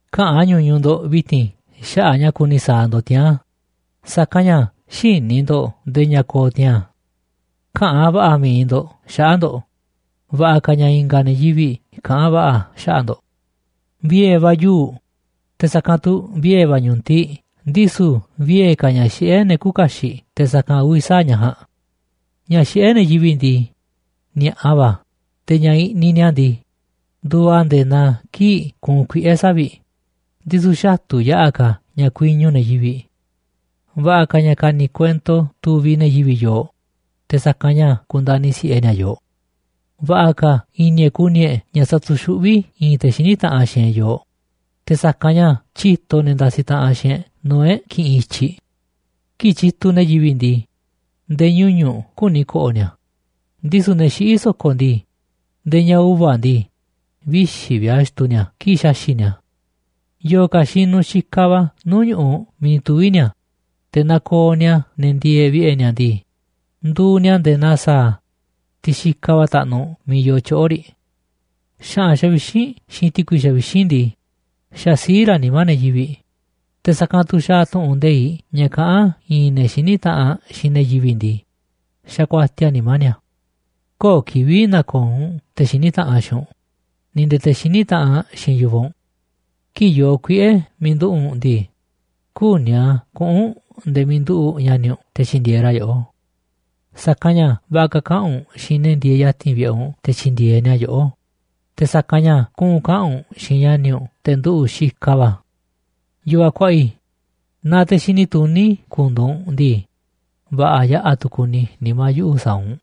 Käꞌa̱n ñuñuꞌ ndo̱ꞌ vi̱ti̱n xaꞌa̱ꞌ ña̱ kuni sa̱a̱ ndo̱ꞌ tiaa̱n, sa̱kanꞌ ña̱ xïní ndo̱ꞌ ndee ña̱ ko̱o̱ tiaa̱n. Käꞌa̱n va̱ꞌa̱ mi̱iꞌ ndo̱ꞌ xaꞌa̱ꞌ ndo̱ꞌ, va̱ꞌa̱ ka̱ ña̱ i̱nga̱ ne̱ yivi̱ꞌ kaꞌa̱n va̱ꞌa̱ xaꞌa̱ꞌ ndo̱ꞌ. Vie̱ va̱ yuu̱ꞌ, te̱ sa̱kanꞌ tu̱ vie̱ va̱ ñu̱tiꞌ, ndisu̱ vie̱ ka̱ ña̱ xiꞌé ne̱ küuꞌ kaxiꞌ te̱ sa̱kanꞌ uvi̱ sa̱aꞌ ña̱ ja̱a̱nꞌ. Ña̱ xiꞌé ne̱ yivi̱ꞌ ndii, ni̱a̱ꞌa va̱ a̱, te̱ ña̱ i̱ꞌniꞌ ni̱a̱ ndii, nduuꞌ a̱ nde̱e̱ naa kii̱ꞌ kuunꞌ kuiꞌe̱ savi̱ꞌ, ndisu̱ xatu̱ yaꞌa̱ ka̱ ña̱ kuiñu ne̱ yivi̱ꞌ. Va̱ꞌa̱ ka̱ ña̱ ka̱ni̱ kuento tuviꞌ ne̱ yivi̱ꞌ yooꞌ te̱ sa̱kanꞌ ña̱ ku̱ndani̱ si̱ꞌe ni̱a̱ yooꞌ. Va̱ꞌa̱ ka̱ i̱ni̱ e̱ꞌ ku̱ni̱ e̱ꞌ ña̱ sa̱tu̱xuꞌví i̱i̱n te̱ xiní taꞌanꞌ xiinꞌ e̱ꞌ yooꞌ, te̱ sa̱kanꞌ ña̱ tyíto ne̱ ndasiꞌ taꞌanꞌ xiinꞌ e̱ꞌ nuu̱ꞌ e̱ꞌ kiꞌinꞌ i̱tyiꞌ. Kii̱ꞌ tyituꞌ ne̱ yivi̱ꞌ ndii, nde̱e̱ ñuñu̱ꞌ küni ko̱ꞌo̱ ni̱a̱, ndisu̱ ne̱ xiꞌí so̱ko̱ ndii, nde̱e̱ ña̱ uva̱ ndii, vixi̱ vi̱ꞌ a̱ xtuu ni̱a̱ kii̱ꞌ xaxi̱ꞌ ni̱a̱ a̱. Yo̱o̱ ka̱ xinuꞌ xikaꞌ va̱ nuu̱ꞌ ñu̱ꞌuꞌ miiꞌ ni̱ tuvi̱ ni̱a̱, te̱ nakooꞌ ni̱a̱ ne̱ ndieeꞌ vi̱ꞌe̱ ni̱a̱ ndii, nduuꞌ ni̱a̱ nde̱e̱ naa sa̱a̱, tiꞌ xikaꞌ va̱ taꞌnuꞌ miiꞌ yoo tyoꞌo̱ riꞌ. Xa̱ꞌa̱n xavixínꞌ xiinꞌ ti̱kui xavixínꞌ ndii, xasiíꞌ raꞌ nimá ne̱ yivi̱ꞌ, te̱ sa̱kanꞌ tu̱ xaaꞌ tu̱ꞌu̱n nde̱iꞌ ña̱ kaꞌán i̱i̱n ne̱ xiní taꞌanꞌ xiinꞌ ne̱ yivi̱ꞌ ndii, xakuatiaꞌ a̱ nimá ni̱a̱. Köo̱ꞌ kivi̱ꞌ na̱ko̱o̱ u̱nꞌ te̱ xiní taꞌanꞌ xiinꞌ u̱nꞌ ni̱ nde̱e̱ te̱ xiní taꞌanꞌ xiinꞌ yu̱vaꞌ u̱nꞌ. Kii̱ꞌ yoo kuiꞌe̱ miiꞌ nduꞌu̱ꞌ u̱nꞌ ndii, küní a̱ kuꞌu̱n u̱nꞌ nde̱e̱ miiꞌ nduꞌu̱ꞌ ña̱ni̱ u̱nꞌ te̱ tyi̱ndi̱e̱eꞌ ra̱ yoꞌó. Sa̱kanꞌ ña̱ va̱ꞌa̱ ka̱ kaꞌa̱n u̱nꞌ xiinꞌ ne̱ ndieeꞌ ya̱ti̱n vi̱ꞌe̱ u̱nꞌ te̱ tyi̱ndi̱e̱eꞌ ni̱a̱ yoꞌó, te̱ sa̱kanꞌ ña̱ kuꞌu̱n kaꞌa̱n u̱nꞌ xiinꞌ ña̱ni̱ u̱nꞌ te̱ nduꞌu̱ꞌ xikaꞌ va̱. Yu̱vaꞌ kuaꞌa i̱, naaꞌ te̱ xini tuní ku̱ndu̱u̱ u̱nꞌ ndii, va̱ꞌa̱ yaꞌa̱ tu̱ ku̱ni̱ nimá yuꞌu̱ sa̱a̱ u̱nꞌ.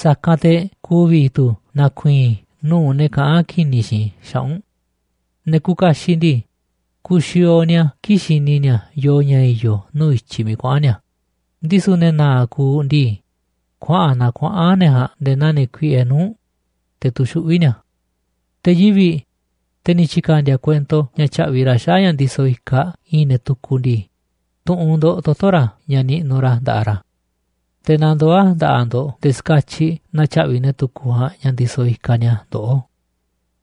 Sa̱kanꞌ te̱ ku̱vi̱ tu̱ na̱ku̱i̱i̱n i̱ nuu̱ꞌ ne̱ kaꞌán ki̱ni̱ xiinꞌ i̱ xaꞌa̱ꞌ u̱nꞌ. Ne̱ kuuꞌ kaxiꞌ ndii, kuuꞌ xiooꞌ ni̱a̱ kii̱ꞌ xini ni̱a̱ yooꞌ ña̱ i̱yo̱ nuu̱ꞌ i̱tyiꞌ miiꞌ kuaꞌa̱n ni̱a̱, ndisu̱ ne̱ na̱a̱ꞌ kuuꞌ ndii, kuaꞌa̱n naa kuaꞌa̱n ne̱ ja̱a̱nꞌ nde̱e̱ naa ne̱ kuiꞌe nuu̱ꞌ, te̱ tuxuꞌví ni̱a̱. Te̱ yivi̱ꞌ, te̱ ni̱ tyi̱ka̱ndi̱a̱ kuento ña̱ tya̱ꞌvi̱ ra̱ xaꞌa̱ꞌ ña̱ ndisoꞌ ikaꞌ i̱i̱n ne̱ tukuꞌ ndii, tu̱ꞌu̱n ndo̱ꞌ toto̱ ra̱ ña̱ niꞌnuꞌ ra̱ nda̱ꞌaꞌ ra̱. Te̱ na ndoo̱ a̱ nda̱ꞌaꞌ ndo̱ꞌ nde̱e̱ ska̱tyiꞌ na̱tyaꞌvi̱ ne̱ tukuꞌ ja̱a̱nꞌ ña̱ ndisoꞌ ikaꞌ ni̱a̱ ndoꞌó.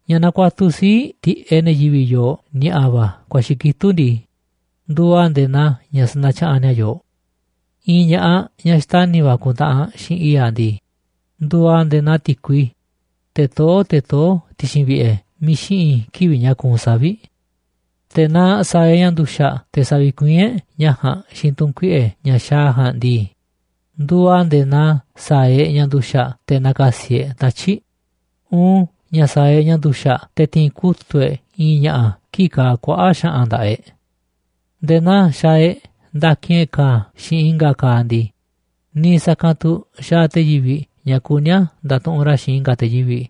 Ña̱ nakuatuꞌ sii̱ꞌ tiꞌeꞌ ne̱ yivi̱ꞌ yooꞌ ni̱a̱ꞌa̱ va̱ ku̱a̱xi̱ kitúꞌ ndii, nduuꞌ a̱ nde̱e̱ naa ña̱ sanatyaꞌanꞌ ni̱a̱ yooꞌ. I̱i̱n ña̱ꞌaꞌ ñaꞌ xtani̱ va̱ ku̱ntaꞌanꞌ xiinꞌ i̱i̱ꞌ aꞌ ndii, nduuꞌ aꞌ nde̱e̱ naa ti̱kui, teꞌ toó te̱ toó ti̱xi̱n vi̱ꞌe̱ miiꞌ xiꞌi̱n kivi̱ꞌ ña̱ kuunꞌ savi̱ꞌ. Te̱ naaꞌ sa̱a̱ e̱ꞌ ña̱ nduxa̱ꞌ te̱ sa̱vi̱kuiín e̱ꞌ ñaꞌ ja̱a̱nꞌ xiinꞌ tu̱n kuiꞌe̱ ña̱ xaaꞌ aꞌ ja̱a̱nꞌ ndii, nduuꞌ a̱ nde̱e̱ naa sa̱a̱ e̱ꞌ ña̱ nduxa̱ꞌ te̱ na̱ka̱si̱ e̱ꞌ tatyi̱ꞌ, uun ña̱ sa̱a̱ e̱ꞌ ña̱ nduxa̱ꞌ te̱ ti̱i̱n kutu̱ꞌ e̱ꞌ i̱i̱n ña̱ꞌa̱ kii̱ꞌ kaaꞌ kuaꞌa̱ꞌ xa̱ꞌa̱n nda̱ꞌaꞌ e̱ꞌ. Nde̱e̱ naa xaaꞌ e̱ꞌ ndakin e̱ꞌ ka̱a̱ xiinꞌ i̱nga̱ ka̱a̱ ndii, niiꞌ sa̱kanꞌ tu̱ xaaꞌ te̱ yivi̱ꞌ ña̱ kuní a̱ nda̱tuꞌunꞌ ra̱ xiinꞌ i̱nga̱ te̱ yivi̱ꞌ,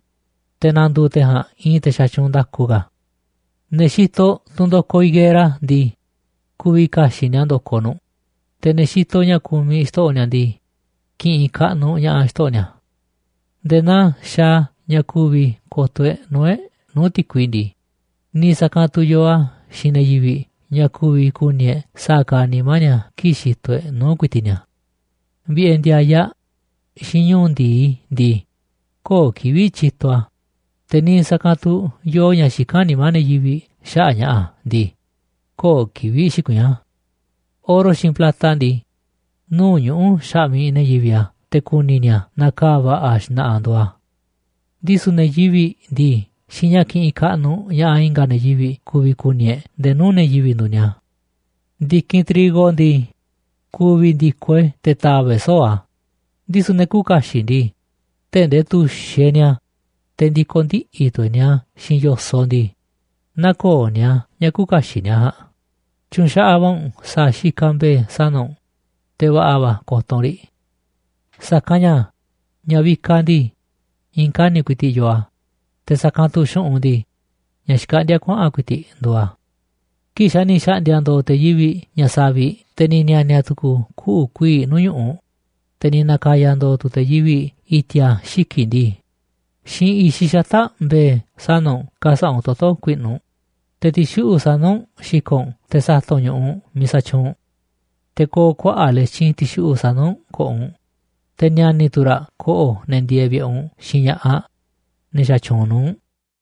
te̱ na̱ndu̱u̱ te̱ ja̱a̱nꞌ i̱i̱n te̱ xatyuunꞌ nda̱ku ka̱. Ne̱ xitoꞌ tunꞌ ndo̱koꞌ higuera ndii, ku̱vi̱ ka̱xi̱ꞌ ni̱a̱ ndo̱koꞌ nu̱ꞌ, te̱ ne̱ xitoꞌ ña̱ kumiꞌ xto̱ꞌo̱ ni̱a̱ ndii, ki̱ꞌi̱n kaꞌnuꞌ ña̱ꞌaꞌ xto̱ꞌo̱ ni̱a̱. Nde̱e̱ naa xaaꞌ a̱ ña̱ ku̱vi̱ ko̱to̱ e̱ꞌ nuu̱ꞌ e̱ꞌ nuu̱ꞌ ti̱kui ndii, niiꞌ sa̱kanꞌ tu̱ yoo a̱ xiinꞌ ne̱ yivi̱ꞌ ña̱ ku̱vi̱ ku̱ni̱ e̱ꞌ sa̱a̱ kaaꞌ nimá ni̱a̱ kii̱ꞌ xitoꞌ e̱ꞌ nuu̱ꞌ ku̱i̱ti̱ꞌ ni̱a̱. Vi̱ꞌe̱ ndi̱a̱yaꞌ xiinꞌ ñu̱u̱ ndi̱i ndii, köo̱ꞌ kivi̱ꞌ tyituꞌ a̱, te̱ niiꞌ sa̱kanꞌ tu̱ yoo ña̱ xikán nimá ne̱ yivi̱ꞌ xaꞌa̱ꞌ ña̱ꞌa̱ ndii, köo̱ꞌ kivi̱ꞌ xikuiín a̱. Oro xiinꞌ plata ndii, nuu̱ꞌ ñuꞌu̱ xaꞌmiꞌ ne̱ yivi̱ꞌ a̱ te̱ ku̱ni̱ ni̱a̱ naaꞌ ka̱a̱ va̱ꞌa̱ xna̱ꞌa̱ nduuꞌ a̱. Ndisu̱ ne̱ yivi̱ꞌ ndii, xiinꞌ ña̱ kiꞌinꞌ kaꞌnuꞌ ña̱ꞌaꞌ i̱nga̱ ne̱ yivi̱ꞌ ku̱vi̱ ku̱ni̱ e̱ꞌ nde̱e̱ nuu̱ꞌ ne̱ yivi̱ꞌ nduuꞌ ni̱a̱. Ndi̱kinꞌ trigo ndii, ku̱vi̱ ndi̱ko̱ e̱ꞌ te̱ ta̱va̱ꞌ e̱ꞌ soo̱ꞌ a̱, ndisu̱ ne̱ küuꞌ kaxiꞌ ndii, tee̱ꞌ ndee tu̱xiꞌ e̱ꞌ ni̱a̱, te̱ ndi̱ko̱ ndiꞌi̱ tu̱ e̱ꞌ ni̱a̱ xiinꞌ yo̱soꞌ ndii, nä̱ko̱o̱ ni̱a̱ ña̱ küuꞌ kaxiꞌ ni̱a̱ ja̱a̱nꞌ. Tyu̱nxaꞌaꞌ va̱ u̱nꞌ sa̱a̱ xikaꞌ mbe̱e̱ sana̱ u̱nꞌ, te̱ va̱ꞌa̱ va̱ ko̱to̱ u̱nꞌ ri̱. Sa̱kanꞌ ña̱ ña̱ vikaꞌ ndii, i̱i̱n kani̱ꞌ ku̱i̱ti̱ꞌ yoo a̱, te̱ sa̱kanꞌ tu̱ xu̱ꞌunꞌ ndii, ña̱ xkaꞌndíá kuaꞌa̱n ku̱i̱ti̱ꞌ nduuꞌ a̱. Kii̱ꞌ xa̱ ni̱ xa̱ꞌndi̱a̱ ndo̱o̱ te̱ yivi̱ꞌ ña̱ saviꞌ, te̱ ni̱ ni̱a̱ni̱a̱ tu̱ku̱u̱ kuꞌu̱ kuii̱ꞌ nuu̱ꞌ ñu̱ꞌuꞌ, te̱ ni̱ na̱ka̱ya̱ ndo̱o̱ tu̱ te̱ yivi̱ꞌ i̱ti̱a̱ xiki̱ꞌ ndii, xiinꞌ i̱xiꞌ xata̱ꞌ mbe̱e̱ sana̱ u̱nꞌ ka̱sa̱ꞌa̱ u̱nꞌ toto̱ ku̱i̱ꞌnu̱ u̱nꞌ, te̱ ti̱xuꞌu̱ꞌ sana̱ u̱nꞌ xi̱ko̱ꞌ u̱nꞌ te̱ sa̱ta̱ꞌ u̱nꞌ ñu̱ꞌuꞌ miiꞌ sa̱tyuunꞌ u̱nꞌ. Te̱ ko̱o̱ kuaꞌa̱ꞌ letyin ti̱xuꞌu̱ꞌ sana̱ u̱nꞌ ko̱ꞌo̱ u̱nꞌ, te̱ ni̱a̱ni̱ tu̱ raꞌ ko̱ꞌo̱ ne̱ ndieeꞌ vi̱ꞌe̱ u̱nꞌ xiinꞌ ña̱ꞌaꞌ ñaꞌ xatyuunꞌ nuu̱ꞌ u̱nꞌ.